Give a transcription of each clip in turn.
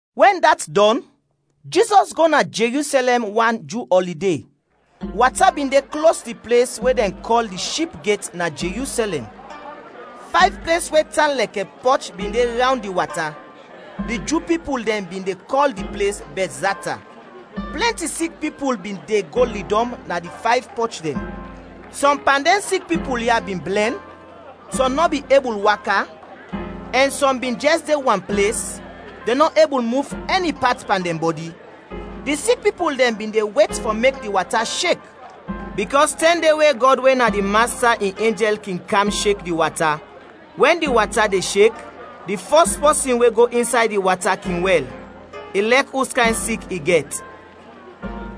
Wɛn dat dɔn, Jizɔs go na Jerusɛlɛm wan Ju ɔlide. Wata bin de klos di ples we dɛn kɔl di Ship Get na Jerusɛlɛm. Fayv ples we tan lɛkɛ pɔch bin de rawnd di wata. Di Ju pipul dɛn bin de kɔl di ples Bɛtzata. Plɛnti sik pipul bin de go ledɔm na di fayv pɔch dɛn. Sɔm pan dɛn sik pipul ya bin blɛn; sɔm nɔ bin ebul waka; ɛn sɔm bin jɛs de wan ples, dɛn nɔ ebul muf ɛni pat pan dɛn bɔdi. [Di sik pipul dɛn bin de wet fɔ mek di wata shek, bikɔs tɛm de we Gɔd we na di Masta in enjɛl kin kam shek di wata. Wɛn di wata de shek, di fɔs pɔsin we go insay di wata kin wɛl, ilɛk uskayn sik i gɛt.]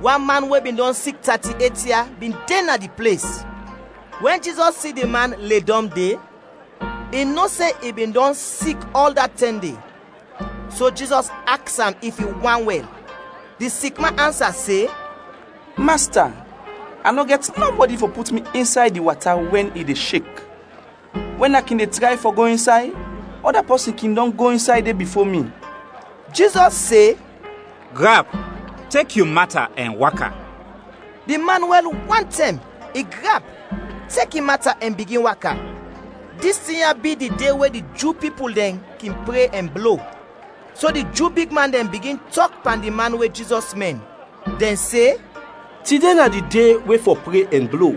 Wan man we bin dɔn sik tati-et ia bin de na di ples. Wɛn Jizɔs si di man ledɔm de, i no se i bin dɔn sik ɔl da tɛm de. So Jizɔs aks am if i want wɛl. Di sik man ansa se, “Masta, a nɔ gɛt nɔbɔdi fɔ put mi insay di wata wɛn i de shek. Wɛn a kin de tray fɔ go insay, ɔda pɔsin kin dɔn go insay de bifo mi.” Jizɔs se, “Grap, tek yu mata ɛn waka!” Di man wɛl wantɛm, i grap, tek in mata ɛn bigin waka. Dis tin ya bi di de we di Ju pipul dɛn kin pre ɛn blo. So di Ju bigman dɛn bigin tɔk pan di man we Jizɔs mɛn. Dɛn se, “Tide na di de we fɔ pre ɛn blo,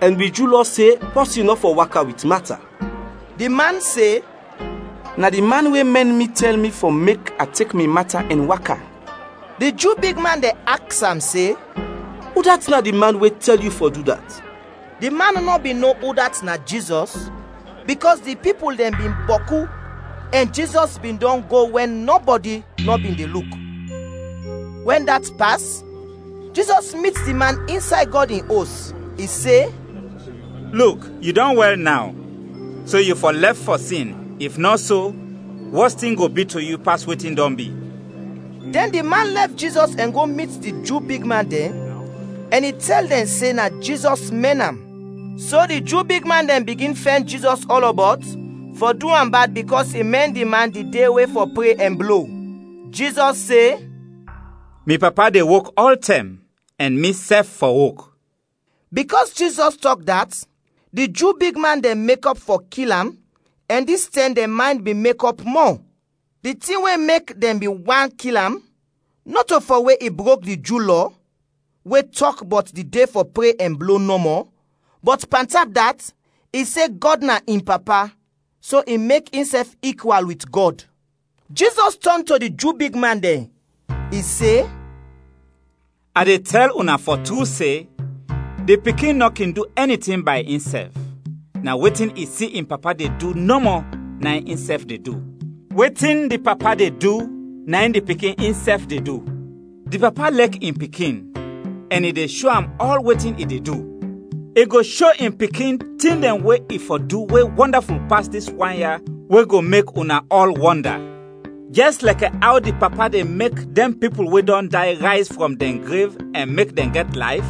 ɛn wi Ju Lɔ se pɔsin nɔ fɔ waka wit mata.” Di man se, “Na di man we mɛn mi tɛl mi fɔ mek a tek mi mata ɛn waka.” Di Ju bigman dɛn aks am se, “Udat na di man we tɛl yu fɔ du dat?” Di man nɔ bin no udat na Jizɔs, bikɔs di pipul dɛn bin bɔku ɛn Jizɔs bin dɔn go wɛn nɔbɔdi nɔ bin de luk. Wɛn dat pas, Jizɔs mit di man insay Gɔd in Os, i se, “Luk, yu dɔn wɛl naw, so yu fɔ lɛf fɔ sin, if nɔ so, wɔs tin go bi to yu pas wetin dɔn bi.” Dɛn di man lɛf Jizɔs ɛn go mit di Ju bigman dɛn, ɛn i tɛl dɛn se na Jizɔs mɛn am. So di Ju bigman dɛn bigin fɛn Jizɔs ɔlɔbɔt fɔ du am bad bikɔs i mɛn di man di de we fɔ pre ɛn blo. Jizɔs se, “Mi Papa de wok ɔltɛm, ɛn misɛf fɔ wok.” Bikɔs Jizɔs tɔk dat, di Ju bigman dɛn mekɔp fɔ kil am ɛn dis tɛm dɛn maynd bin mekɔp mɔ. Di tin we mek dɛn bin want kil am nɔto fɔ we i brok di Ju Lɔ we tɔk bɔt di de fɔ pre ɛn blo nɔmɔ, bɔt pantap dat, i se Gɔd na in Papa, so i mek insɛf ikwal wit Gɔd. Jizɔs tɔn to di Ju bigman dɛn. I se, “A de tɛl una fɔ tru se, di Pikin nɔ kin du ɛni tin bay insɛf, na wetin i si in Papa de du nɔmɔ, na in insɛf de du. Wetin di Papa de du, na in di Pikin insɛf de du. Di Papa lɛk in Pikin, ɛn i de sho am ɔl wetin i de du; i go sho in Pikin tin dɛn we i fɔ du we wɔndaful pas dis wan ya we go mek una ɔl wɔnda. Jɛs lɛkɛ aw di Papa de mek dɛn pipul we dɔn day rayz frɔm dɛn grev ɛn mek dɛn gɛt layf,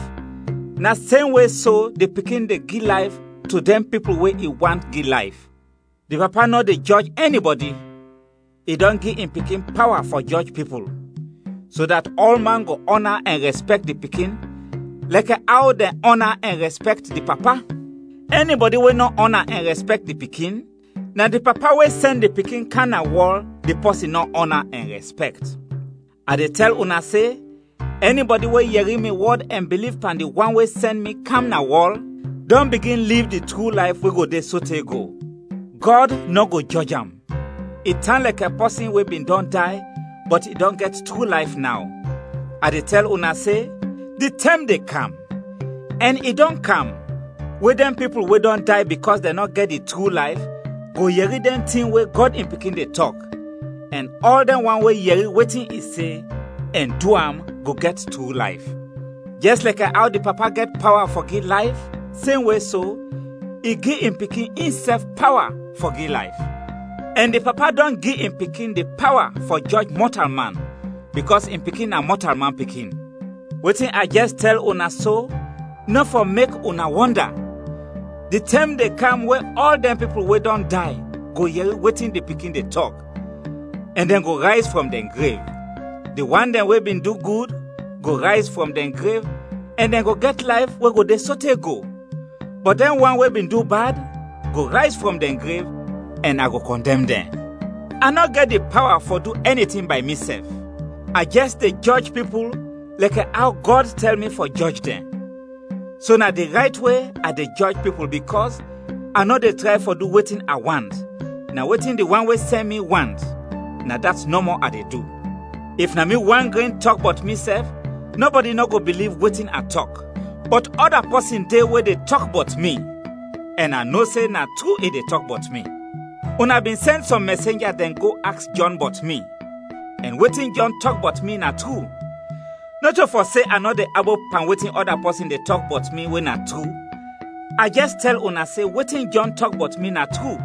na semwe so, di Pikin de gi layf to dɛn pipul we i want gi layf. Di Papa nɔ de jɔj ɛnibɔdi, i dɔn gi in Pikin pawa fɔ jɔj pipul, so dat ɔlman go ɔna ɛn rɛspɛkt di Pikin lɛkɛ aw dɛn ɔna ɛn rɛspɛkt di Papa. Ɛnibɔdi we nɔ ɔna ɛn rɛspɛkt di Pikin, na di Papa we sɛn di Pikin kam na wɔl di pɔsin nɔ ɔna ɛn rɛspɛkt. “A de tɛl una se, ɛnibɔdi we yɛri mi wɔd ɛn biliv pan di wan we sɛn mi kam na wɔl, dɔn bigin liv di tru layf we go de sote go. Gɔd nɔ go jɔj am, i tan lɛkɛ pɔsin we bin dɔn day, bɔt i dɔn gɛt tru layf naw. A de tɛl una se, di tɛm de kam ɛn i dɔn kam we dɛn pipul we dɔn day bikɔs dɛn nɔ gɛt di tru layf, go yɛri dɛn tin we Gɔd in Pikin de tɔk, ɛn ɔl dɛn wan we yɛri wetin i se ɛn du am go gɛt tru layf. Jɛs lɛkɛ aw di Papa gɛt pawa fɔ gi layf, semwe so, i gi in Pikin insɛf pawa fɔ gi layf. Ɛn di Papa dɔn gi in Pikin di pawa fɔ jɔj mɔtalman bikɔs in Pikin na Mɔtalman Pikin. Wetin a jɛs tɛl una so nɔ fɔ mek una wɔnda, di tɛm de kam we ɔl dɛn pipul we dɔn day go yɛri wetin di Pikin de tɔk, ɛn dɛn go rayz frɔm dɛn grev: di wan dɛn we bin du gud, go rayz frɔm dɛn grev ɛn dɛn go gɛt layf we go de sote go; bɔt dɛn wan we bin du bad, go rayz frɔm dɛn grev, ɛn a go kɔndɛm dɛn. “A nɔ gɛt di pawa fɔ du ɛni tin bay misɛf; a jɛs de jɔj pipul lɛkɛ aw Gɔd tɛl mi fɔ jɔj dɛn, so na di rayt we a de jɔj pipul bikɔs a nɔ de tray fɔ du wetin a want, na wetin di wan we sɛn mi want, na dat nɔmɔ a de du. “If na mi wan gren tɔk bɔt misɛf, nɔbɔdi nɔ go biliv wetin a tɔk. Bɔt ɔda pɔsin de we de tɔk bɔt mi, ɛn a no se na tru i de tɔk bɔt mi. Una bin sɛn sɔm mɛsenja dɛn go aks Jɔn bɔt mi, ɛn wetin Jɔn tɔk bɔt mi na tru. Nɔto fɔ se a nɔ de abop pan wetin ɔda pɔsin de tɔk bɔt mi, we na tru, a jɛs tɛl una se wetin Jɔn tɔk bɔt mi na tru,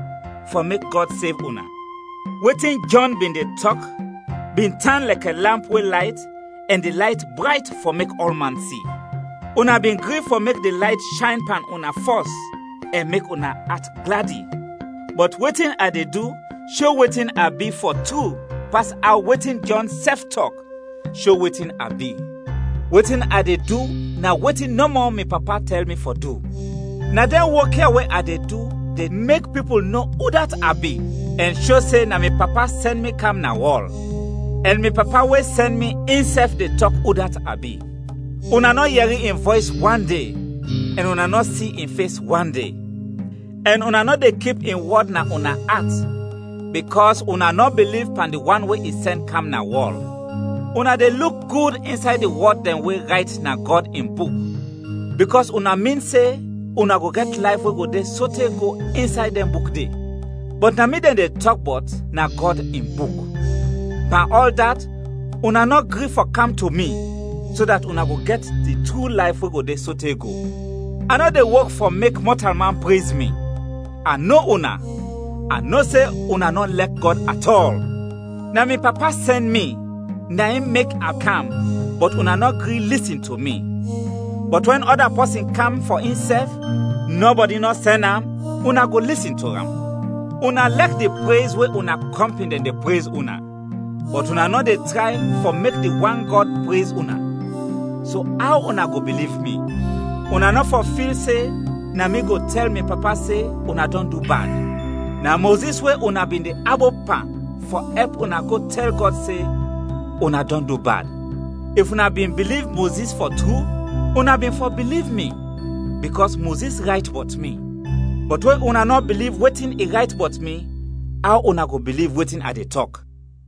fɔ mek Gɔd sev una. Wetin Jɔn bin de tɔk bin tan lɛkɛ lamp we layt ɛn di layt brayt fɔ mek ɔlman si. Una bin gri fɔ mek di layt shayn pan una fɔs ɛn mek una at gladi. Bɔt wetin a de du sho wetin a bi fɔ tru pas aw wetin Jɔn sɛf tɔk, sho wetin a bi; wetin a de du na wetin nɔmɔ mi Papa tɛl mi fɔ du. Na dɛn wok ya we a de du de mek pipul no udat a bi ɛn sho se na mi Papa sɛn mi kam na wɔl. Ɛn mi Papa we sɛn mi insɛf de tɔk udat a bi. Una nɔ yɛri in vɔys wande ɛn una nɔ si in fes wande. Ɛn una nɔ de kip in wɔd na una at bikɔs una nɔ biliv pan di wan we i sɛn kam na wɔl. Una de luk gud insay di wɔd dɛn we rayt na Gɔd in Buk, bikɔs una min se una go gɛt layf we go de sote go insay dɛn buk de. Bɔt na mi dɛn de tɔk bɔt na Gɔd in Buk. Pan ɔl dat, una nɔ gri fɔ kam to mi, so dat una go gɛt di tru layf we go de sote go. “A nɔ de wok fɔ mek mɔtalman prez mi. A no una, a no se una nɔ lɛk Gɔd at ɔl. Na mi Papa sɛn mi, na in mek i kam, bɔt una nɔ gri lisin to mi; bɔt wɛn ɔda pɔsin kam fɔ insɛf, nɔbɔdi nɔ sɛn am, una go lisin to am. Una lɛk di prez we una kɔmpin dɛn de prez una, bɔt una nɔ de tray fɔ mek di wan Gɔd prez una, so aw una go biliv mi? Una nɔ fɔ fil se na mi go tɛl mi Papa se una dɔn du bad. Na Mozis we una bin de abop pan fɔ ɛp una go tɛl Gɔd se una dɔn du bad. If una bin biliv Mozis fɔ tru, una bin fɔ biliv mi, bikɔs Mozis rayt bɔt mi. Bɔt we una nɔ biliv wetin i rayt bɔt mi, aw una go biliv wetin a de tɔk?”